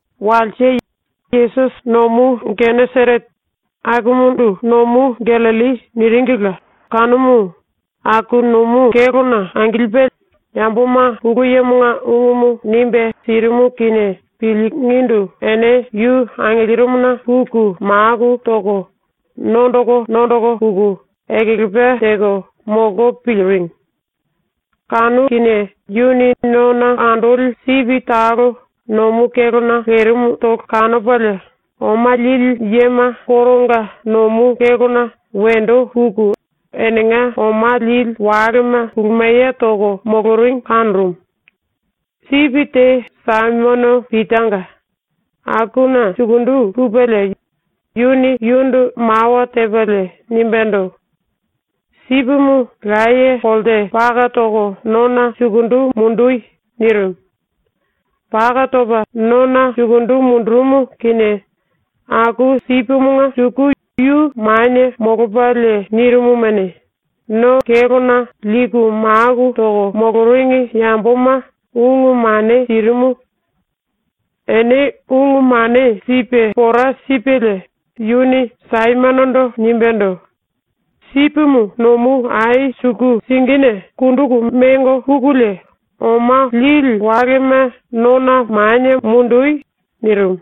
Walse, Yesusi nomu Geneserete, ⸤akumundu ‘Nomu Gallilli’ niringila kanumu,⸥ aku nomu kélona angilipe yamboma Pulu Yemonga ungumu nimbe sirimu kinie pilingindu ene yu angilirimuna puku maku toko nondoko nondoko puku ekelepa teko molko piliringi. Kanu kinie yuni nona andoli sipi talo nomu kélona lerimutolo kanopalie, oma lili yema koronga nomu kélona wendo puku enenga oma lili walema kulumiye toko moloringi kanorumu. Sipi te Saimono Pitanga, akuna sukundu pupelie yuni yundu mawa tepalie nimbendo: “Sipimu laye kolte paka toko nona sukundu mundoi.” nirimu. Paka topa nona sukundu mundurumu kinie aku sipimunge suku yu manie molopalie nirimumuni, no kélona liku maku toko moloringi yamboma ungu mane sirimu. Ene ungu mane sipe pora sipelie yuni Saimonondo nimbendo: “Sipimu nomu ai suku singine kunduku mengo pukulie oma lili walema nona manie mundu.” nirimu.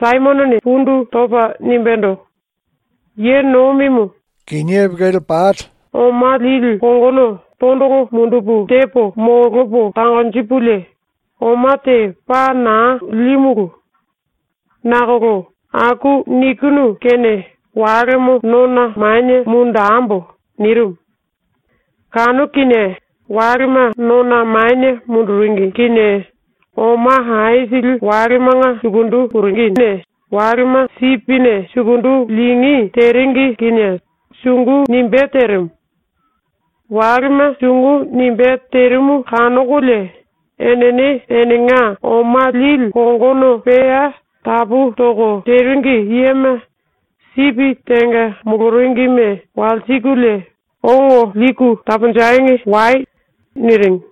Saimonone pundu topa nimbendo: “Ye Nomimu, sumbulu telu oma lili kongono tondolo mundupu tepo molopo tangonjipulie oma te paa naa límulu. Nakolo aku nikinu kene walemo nona manie mundembo.” nirimu. Kanu kinie walema nona manie munduringi kinie oma aisili walemanga sukundu puringine walema nomu sipine sukundu lingí teringi kinie sungu nimbé terimu. Walema sungu nimbé terimu kanokolie enene enenga oma lili kongono pea tapu toko teringi yema, sipi tenga moloringime walsikulie “Ongo liku taponjengi wai.” niringi.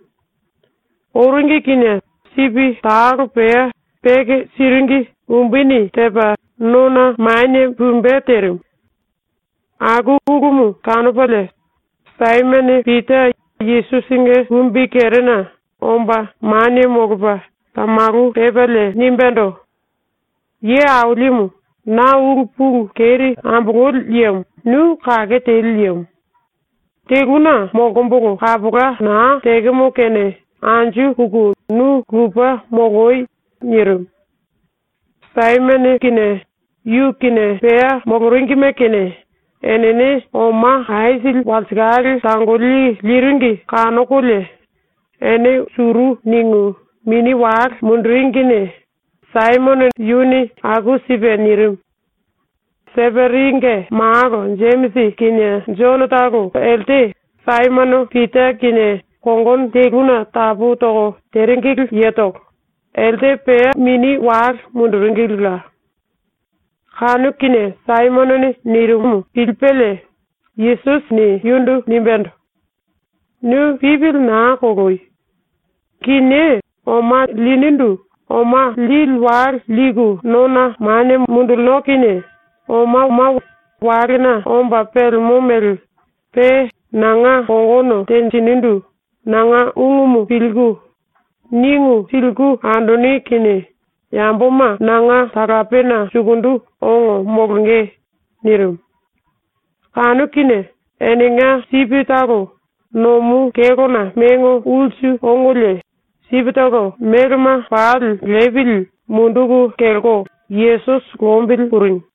Oringi kinie sipi talo pea peke siringi umbuni tepa nona manie pumbe terimu. Aku ulumu kanopalie Saimono Pita Yesusinge kumbikerena omba manie molopa tamalu pepalie nimbendo: “Ye Ailimu, na ulu pulu keri ambololi yemo ⸤nu kake teli yemo⸥. ⸤Teluna molkombolo kapola naa tekemo⸥ kene anju puku nu lupe moloi.” nirimu. Yu kinie, yu kinie pea moloringime kinie, enene oma aisili walsikale tangoli liringi kanokolie ene suru ningu mini wale munduringine ⸤Saimonone aku sipe nirimu⸥. Seperinge malo Jemisi kinie Jonotolo elte Saimono Pita kinie kongono teluna tapu toko teringili yetolo, elte pea mini wale munduringilila. Kanu kinie Saimonone nirimumu pilipelie Yesusini yundu nimbendo: “Nu pipili naa koloyo. Kinié oma linindu oma lili wale liku nona manie mundulino kinie omama walena omba pelemo mele, pe nanga kongono tenjinindu nanga ungumu pilku ningu siliku andoni kinie yamboma nanga talapena sukundu ongo molonge.” nirimu. Kanu kinie enenga sipitolo nomu kélona mengo ulsu ongolie, sipitolo melema pali lepili munduku kelko Yesusi lombili puringi.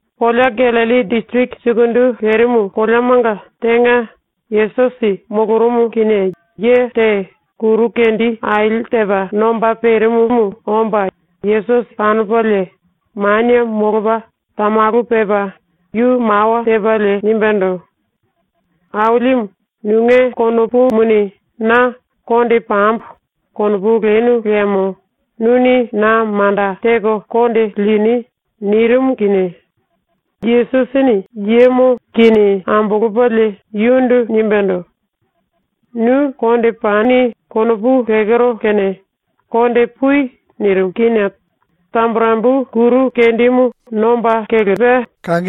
⸤Kolea Gallilli disiriki sukundu lerimu⸥ koleamanga tenga Yesusi molorumu kinie ye te kuru kendi aili tepa nomba perimumu omba Yesusi kanopalie manie molopa tamalu pepa yu mawa tepalie nimbendo: “Ailimu, nunge konopumuni na ‘Konde pambo.’ konopu lenu liemo nuni na manda teko konde lini.” nirimu kinie Yesusini yemo kini ambolopalie yundu nimbendo: “‘Nu konde pani.’ konopu lekero kene konde pui.” nirimu kinie tamburembu kuru kendimu nomba kelerimu.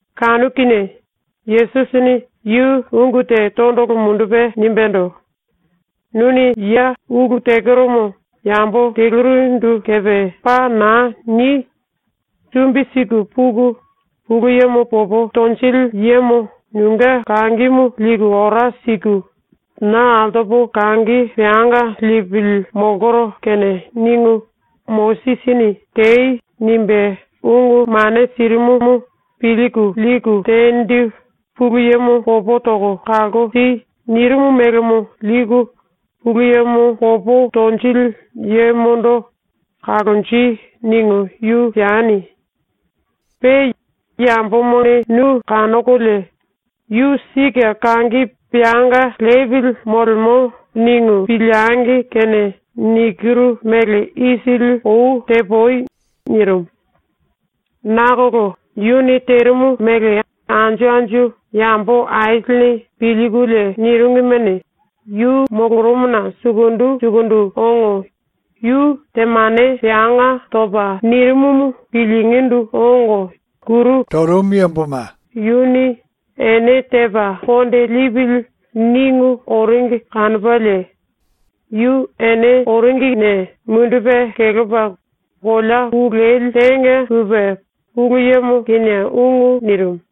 Kanu kinie Yesusini yu ungu te tondolo mundupe nimbendo: “Nuni ya ulu tekeromo yambo telurindu kepe paa naa ni! Sumbi siku puku Pulu Yemo popo tonjili yemo nunge kangimu liku ora siku, ‘Na altopo kangi peanga lepili molkoro kene.’ ningu Mosisini “Tei.” nimbe ungu mane sirimumu pilku liku tenindu “Pulu Yemo popo toko kalko si.” nirimu melemo liku Pulu Yemo popo tonjili yemondo “Kalonji.” ningu yu sieni. Pe yambomane nu kanokolie ‘Yu sike kangi peanga lepili molemo.’ ningu piliengi kene nikiru mele isili ou tepui.” nirimu. Nakolo yuni terimu mele anju anju yambo aisilini pilkulie niringimuni, yu molorumuna sukundu sukundu ongo yu temane peanga topa nirimumu pilingindu ongo, yuni ‘Ene tepa konde lipili.’ ningu oringi kanopalie yu ene oringine mundupe kelepa kolea ku leli tenga pupe Pulu Yemo kinie ungu nirimu.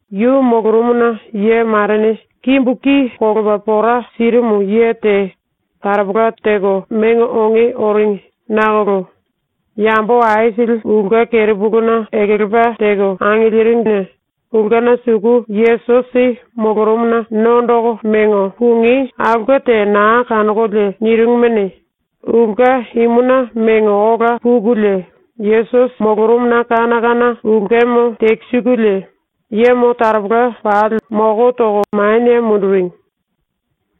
Yu molorumuna ye marene kimbu ki kolopa pora sirimu ye te taropola teko mengo onge oringi nakolo yambo aisili ulke kerepuluna ekelepa teko angiliringine ulkena suku Yesusi molorumuna nondoko mengo pungí aulke te naa kanokolie niringimuni, ulke imuna mengo ola pukulie Yesusi molorumuna ⸤kana kana ulkemo tekisikulie⸥ yemo taropola pali moko toko manie munduringi.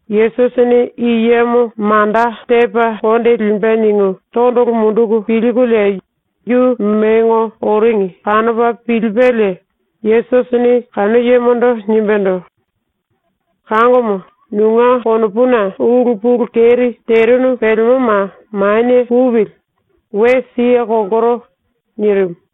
‘Yesusini i yemo manda tepa konde limbe.’ ningu tondolo munduku pilkulie yu mengo oringi kanopa pilipelie Yesusini kanu yemondo nimbendo: “Kangomo, nunge konopuna ulu pulu keri terinu pelemoma manie pupili, we siye kolkoro.” nirimu.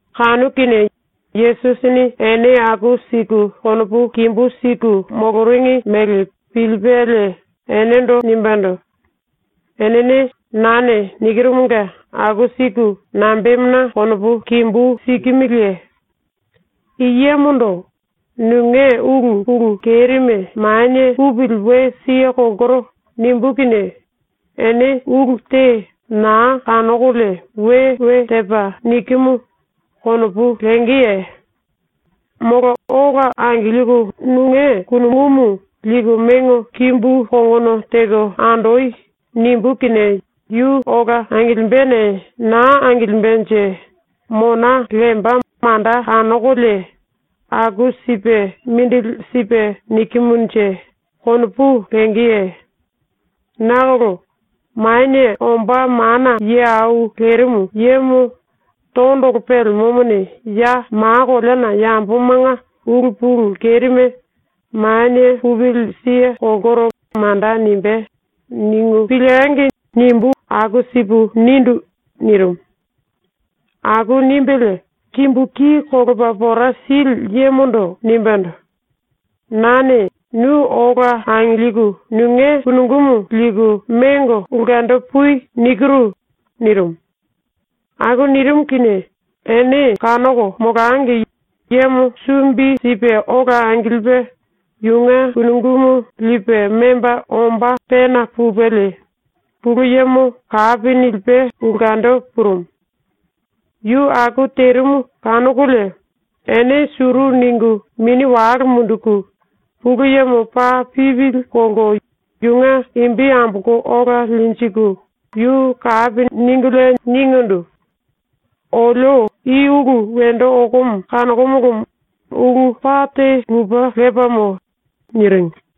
Kanu kinie Yesusini ene aku siku konopu kimbú siku moloringi mele pilipelie enendo nimbendo: “Enene ⸤nane nikirumunge⸥ aku siku nambemuna konopu kimbú sikimiliye? I yemondo “Nunge ulu pulu kerime manie pupili, we siye kolkoro.” nimbú kinie ene ulu te naa kanokolie ‘We we tepa nikimu.’ konopu lengeye? Molo “Ola angilku nunge kunungumu liku mengo kimbu kongono teko andoi.” nimbú kinie yu ola angilimbene naa angilimbenje mona lemba manda kanokolie ‘Aku sipe mindili sipe nikimunje?’ konopu lengeye? Nakolo ‘ ‘Manie Omba Mana Ye Au Lerimu Yemo tondolo pelemomone ya ma koleana yambomanga ulu pulu kerime “Manie pupili, siye kolkoro.” manda nimbé.’ ningu piliengi!’ nimbu ⸤aku sipu nindu⸥.” nirimu. Aku nimbelie kimbu ki kolopa pora sili yemondo nimbendo: “Nane ‘Nu ola angilku nunge kunungumu liku mengo ulkendo pui.’ nikiru.” nirimu. Aku nirimu kinie ene kanoko molangi yemo sumbi sipe ola angilipe yunge kunungumu lipe memba omba pena pupelie Pulu Yemo kapi nilipe ulkendo purumu. ⸤Yu aku terimu kanokolie⸥ ene suru ningu mini wale munduku Pulu Yemo paa pipili kolko yunge imbi ambolko ola linjiku yu kapi ningulie ningindu: “Olio i ulu wendo okomo kanokomolomo ulu paa te lupe lepamo.” niringi.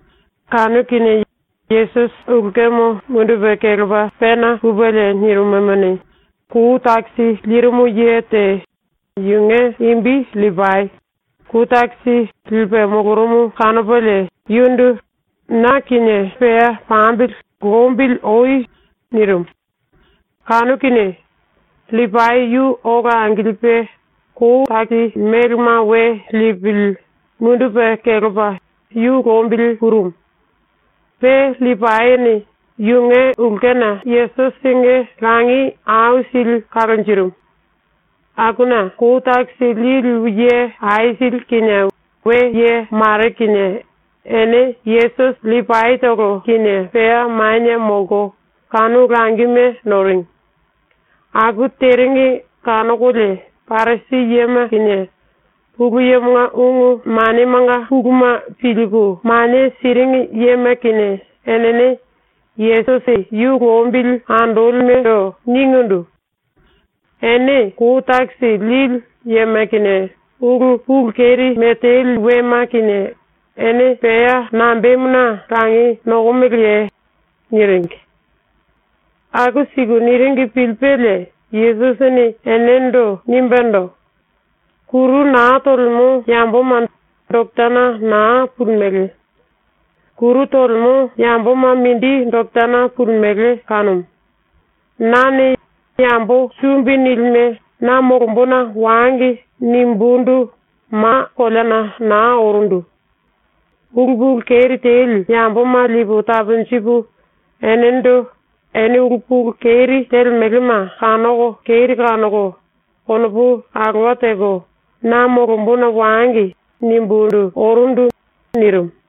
Kanu kinie Yesusi ⸤ulkemo mundupe kelepa⸥ pena pupelie nirimumuni, kou takisi lirimu ye te, yunge imbi LLipai, kou takisi lipe molorumu kanopalie yundu “Na kinie pea pambili lombili oi.” nirimu. Kanu kinie LLipai yu ola angilipe kou takisi melema we lepili mundupe kelepa yu lombili purumu. Pe LLipaini yunge ulkena Yesusinge langi aisili kalonjirimu. Akuna kou takisi lili ye aisili kinie, we ye mare kinie, ene Yesusi LLipaitolo kinie pea manie molko kanu langime noringi. Aku teringi kanokolie Parisi yema kinie, Pulu Yemonga ungu manemanga puluma pilku mane siringi yema kinie, enene Yesusi yu lombili andolimendo ningindu: “Ene kou takisi lili yema kinie ulu pulu kerime teli wema kinie ene pea nambemuna langi nokomeleye?” niringi. Aku siku niringi pilipelie Yesusini enendo nimbendo: “Kuru naa tolemo yamboma doketana naa pulimele. Kuru tolemo yamboma mindi doketana pulimele kanumu. Nane ‘Yambo sumbi nilime na molombona wangi.’ nimbundu ma koleana naa orundu. Ulu pulu keri teli yamboma ⸤lipu taponjipu⸥ enendo ‘Ene ulu pulu keri telemelema kanoko keri kanoko konopu alowa teko ⸤na molombona wangi⸥.’ nimbundu orundu.” nirimu.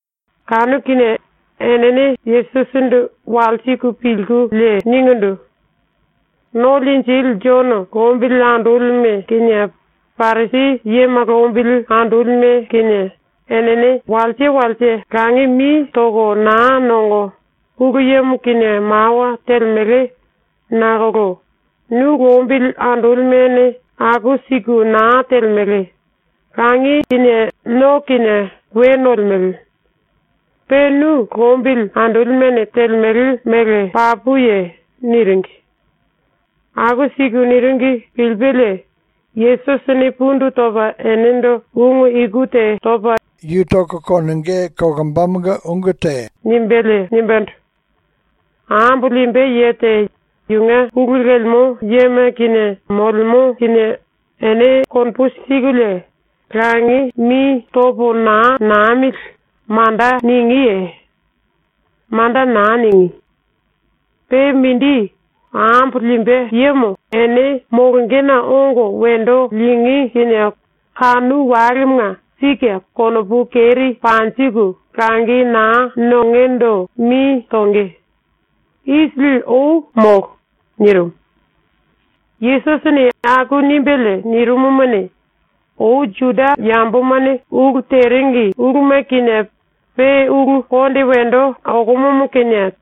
⸤Kanu kinie⸥ enene Yesusindu walsiku pilkulie ningindu: “⸤No Linjili⸥ Jono lombili andolime kinie, Parisi yema lombili andolime kinie, enene walse walse langi mi toko naa nongo Pulu Yemo kinie mawa telemele nakolo nu lombili andolimene aku siku naa telemele, langi kinie no kinie we nolemele. ⸤Pe nu lombili andolimene telemele mele papuye⸥?” niringi. Aku siku niringi pilipelie Yesusini pundu topa enendo ⸤ungu iku te topa yu kinie ulu te wendo ombá mele nimbelie⸥ nimbendo: “Ambo limbe ye te yunge pulu lemo yema kinie molemo kinie ene konopu sikulie “Langi mi topo naa namili.” manda ningíye? Manda naa ningí. Pe mindi, ambo limbe yemo ene molongena ongo wendo lingí kinie kanu walemanga sike ⸤konopu keri panjiku⸥ langi naa nongendo mi tonge. ⸤Isili ou molo.⸥” nirimu. Yesusini aku nimbelie nirimumuni, ⸤‘Ou Juda yambomane ulu teringi uluma kinie pe ulu konde wendo okomomo kinie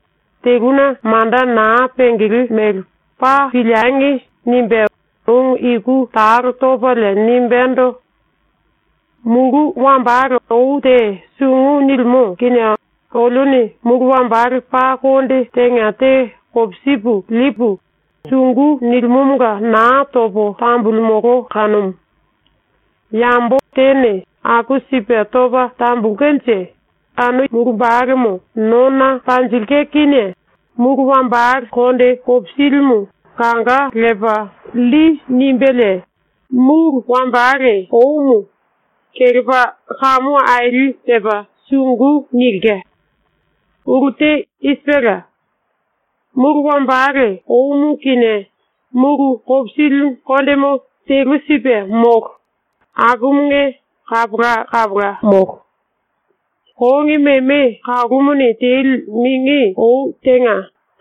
teluna manda naa pengele mele paa piliengi!’ nimbe⸥ ungu iku talo topalie nimbendo: “Mulu wambale ou te sungu nilimo kinie olione mulu wambale paa konde tenga te kopisipu lipu, sungu nilimomonga naa topo tambululimolo kanumu. Yambo tene aku sipe topa tambulkenje kanu mulumbalemo nona panjilke kinie mulu wambale konde kopisilimu kanga lepa lli nimbelie mulu wambale oumu kelepa kamu aili tepa sungu nilke. Ulu te i sipela: Mulu wambale oumu kinie mulu kopisili kondemo telu sipe molo akumunge kapola kapola molo. Kongi meme kalumuni teli mingi ou tenga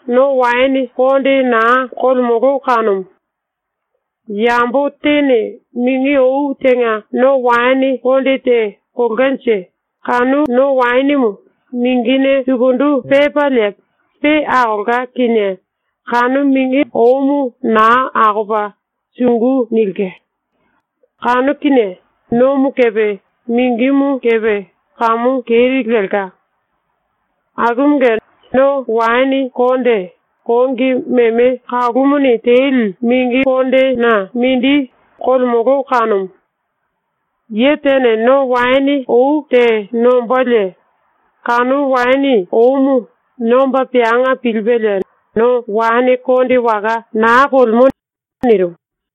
no waene konde naa kolemolo kanumu. Yambo tene mingi ou tenga no waene konde te kolkanje kanu no waenemo mingine sukundu pepalie pe akolka kinie kanu mingi oumu naa akopa sungu nilke. Kanu kinie nomo kepe mingimu kepe kamu keri lelka. Akumunge no waene konde kongi meme kalumuni teli mingi kondena mindi kolemolo kanumu. Ye tene no waene ou te nombalie kanu waene oumu nomba peanga pilipelie no waene konde waka naa kolemo.” nirimu.